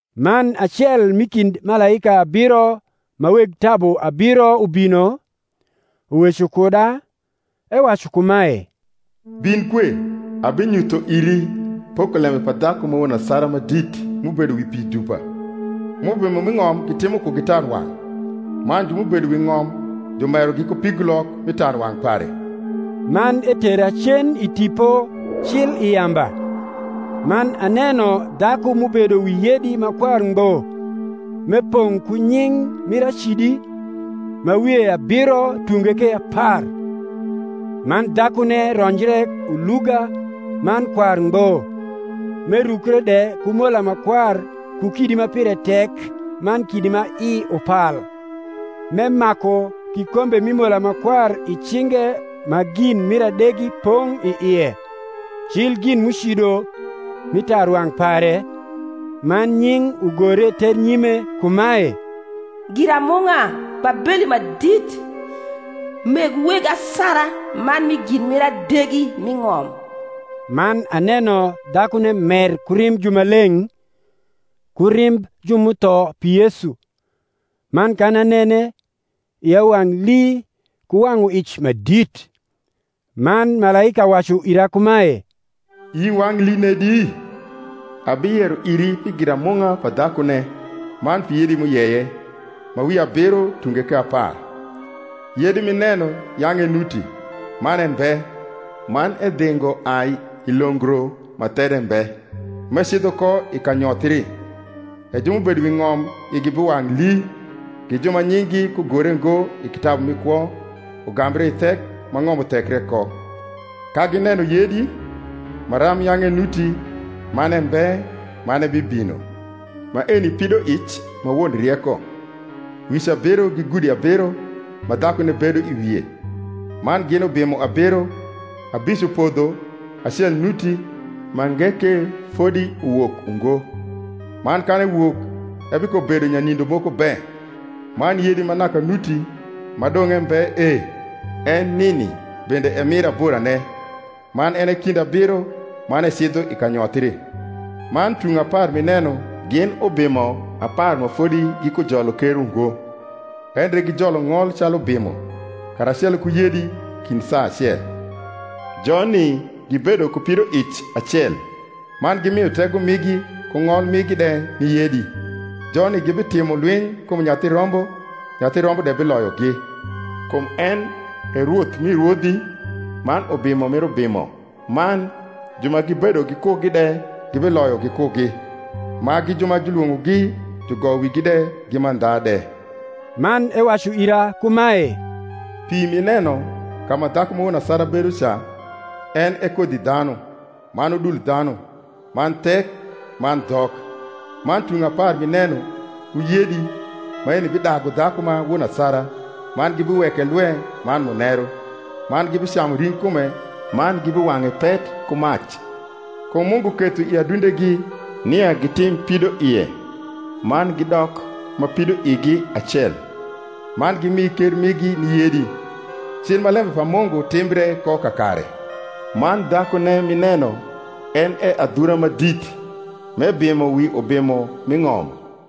Man acel m’i kind malaika abiro ma weg tabu abiro ubino, uweco kuda, ewacu kumae, Bin kue, abinyutho iri pokolembe pa dhaku ma won asara ma dit m’ubedo wi pi dupa; m’ubimo m’i ng’om gitimo kugi tarwang’, man ju m’ubedo wi ng’om jumerogi ku pigulok mi tarwang’ pare. Man etera cen i Tipo cil i yamba: man aneno dhaku m’ubedo wi yedi ma kwar ngbo, m’epong’ ku nying’ mir acidi, ma wie abiro tunge ke apar. Man dhakune ronjre uluga man kwar ngbo, m’erukre de ku mola ma kwar ku kidi ma pire tek man kidi ma i upal, m’emaku kikombe mi mola ma kwar i cinge ma gin mir adegi pong’ i ie, cil gin m’ucido mi tarwang’ pare, man nying’ ugore ternyime kumae, GIRAMUNG’A BABELI MA DIT, MEG WEG ASARA MAN MI GIN MIR ADEGI M’I NG’OM. Man aneno dhakune mer ku rimb jumaleng’, ku rimb ju m’utho pi Yesu. Man kan anene, ia wang’ lii ku wang’nic ma dit. Man malaika wacu ira kumae, Ii wang’ lii nedi? Abiyero iri pi giramung’a pa dhakune, man pi yedi m’uyeye, ma wie abiro tunge ke apar. Yedi m’ineno yang’ enuti, man embe: man edhingo ai i longro ma there mbe, m’ecidho ko i kanyothri. E ju m’ubedo wi ng’om igi biwang’ lii, gi ju ma nying’gi kugore ngo i kitabu mi kwo ugambre i thek ma ng’om uthekre ko, ka gineno yedi, maram yang’ enuti, man embe, man ebibino. Maeni pidoic ma won rieko. Wic abiro gi gudi abiro, ma dhakune bedo i wie: man gin ubimo abiro; abic upodho, acel nuti, mange ke fodi uwok ungo; man kan ewok, ebikobedo nyanindo moko be. Man yedi ma naka nuti, ma dong’ embe e, en nini bende en e mir aborane, man en e kind abiro man ecidho i kanyothri. Man tung apar m’ineno gin ubimo apar ma fodi gikujolo ker ungo; endre gijolo ng’ol calu ubimo, karacelo ku yedi, kind saa acel. Joni gibedo ku pidoic acel, man gimio tego migi ku ng’ol migi de ni yedi. Joni gibitimo lwiny kum Nyathi Rombo, Nyathi Rombo de biloyogi, kum en e Rwoth mi rwodhi, man Ubimo mir ubimo; man ju ma gibedo gikugi de gibiloyo gikugi, ma gi ju ma julwong’ogi jugoyo wigi de gi mandha de. Man ewacu ira kumae, Pi m’ineno, ka ma dhaku ma won asara bedo ca, en e kodhidhanu, man udul dhanu, man thek, man dhok. Man tung apar m’ineno, ku yedi, maeni bidagu dhaku ma won asara, man gibiweke lwe man muneru, man gibicamu ring’kume, man gibiwang’e pet ku mac. Kum Mungu ketho i adundegi nia gitim pidoie, man gidok ma pidoigi acel, man gimi ker migi ni yedi, cii ma lembe pa Mungu timbre ko kakare. Man dhakune m’ineno en e adhura ma dit, m’ebimo wi ubimo m’i ng’om.